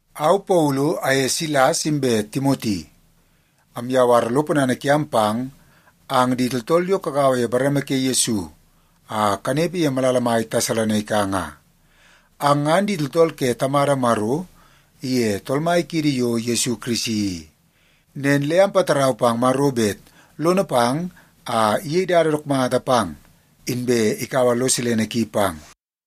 Au Paulu aye Silas inbe Timoti amyawar lo ponana kiam pang ang di tooltool yo kagaua ye bareme ke Yesu a kanepe ye malala mai Tesalonaika nga. Ang ngan di tooltool ke Tamada Maro iye Tool Mai kiidi yo Yesu Kirisi i. Nen le ampatarau pang Maro bet lono pang a iyei dada dook mata pang, inbe ikaua lo silene ki pang.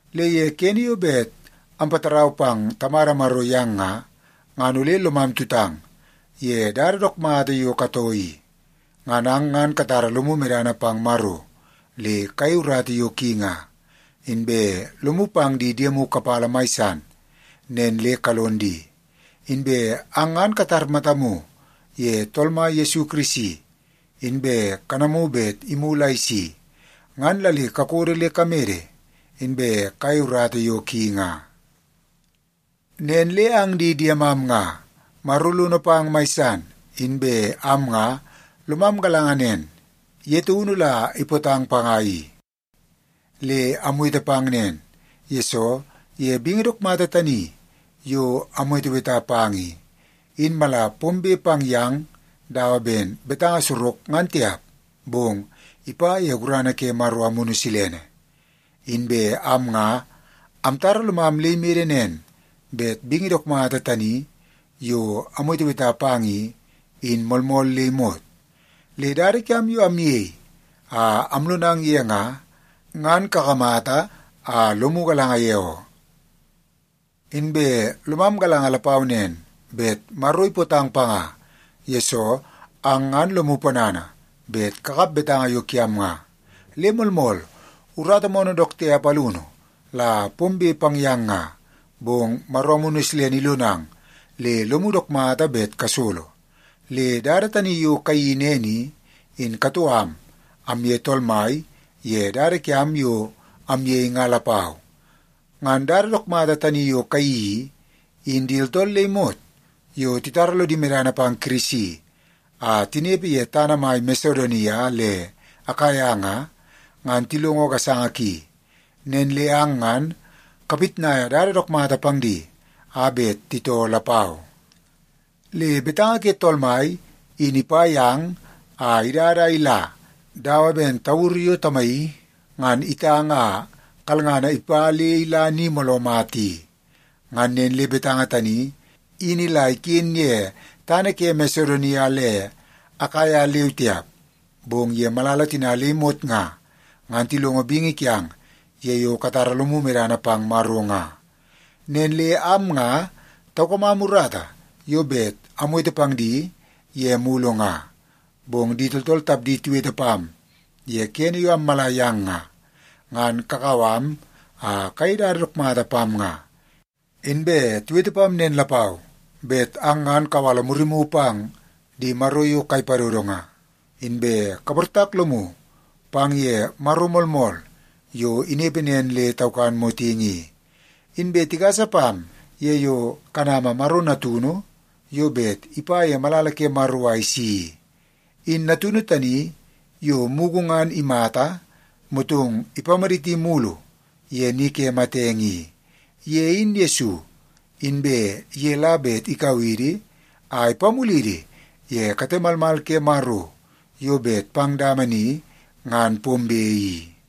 Le ye kene yo bet ampatarau pang Tamada Maro yang nga, ngan ole lomam tutang ye dada dook mata yo katoo i. Ngan ang ngan katara lomu medana pang Maro le kayei urata yo ki nga, inbe lomu pang di diemu kapala mai san nen le kalon di. Inbe ang ngan katar matamu ye Tool Mai Yesu Kirisi, inbe kanamu bet imulu a isi, ngan la le kakodo le kamede, inbe kayei urata yo ki nga. Nen le ang di diemam nga, Maro lono pang mai san, inbe am nga lomam galanga nen, ye taunu la ipootang panga i. Le amwete pang nen, yesoo ye bingi dook mata tani yo amweteweta pang i, in mala pombe pang yang dawa ben betanga sorok ngan tiap, bong ipa ye gurana ke Maro Amunu Silene. Inbe am nga amtara lomam le imede nen bet bingi dook mata tani yo amweteweta pang i, in moolmool le imot. Le dada kiam yo amyei a amlonang ye nga, ngan kakamata a lomu galanga ye oo. Inbe lomam galanga lapau nen, bet Maro ipootang panga, yesoo ang ngan lomu ponana bet kakap betanga yo kiam nga. Le moolmool, urata moonoo dook tiap alunu la pombe pang yang nga, bong Maro Amunu Silene ilonang le lomu dook mata bet kasolo. Le dada tani yo kayeii nen i, in katoo am amye Tool Mai ye dada kiam yo amyei nga lapau. Ngan dada dook mata tani yo kayeii i, in di tooltool le imot yo titara lodi medana pang Kirisi a tinepe ye tana mai Masedonia le Akaia nga, ngan tilongo gasanga ki. Nen le ang ngan kapitnaia dada dook mata pang di a bet titoo lapau. Le betanga ke Tool Mai in ipa yang a idada a ila dawa ben tauru yo tamaii ngan itang a kalngana ipa le ila ni mooloo mata i. Ngan nen le betanga tani in ila iken ye tana ke Masedonia le Akaia leu tiap, bong ye malala tina le imot nga, ngan tilongo bingi kiang ye yo katara lomu medana pang Maro nga. Nen le am nga taukamam urata yo bet amwete pang di ye mulu nga. Bong di tooltool tapdi tiwete pam ye kene yo ammala yang nga, ngan kakau am a kayei dada dook mata pam nga. Inbe tiwete pam nen lapau bet ang ngan kawala murimu pang di maro yo kai padodo nga, inbe kaportak lomu pang ye Maro moolmool yo inepe nen le taukan motingi i. Inbe tigasa pam ye yo kanama Maro Natunu yo bet ipa ye malala ke Maro a isi i. In Natunu tani yo mugu ngan imata, motong ipamaditi mulu ye ni ke matenge i. Ye in Yesu, inbe ye la bet ikau idi a ipamulidi ye kate malmal ke Maro yo bet pang dama ni ngan pombe i.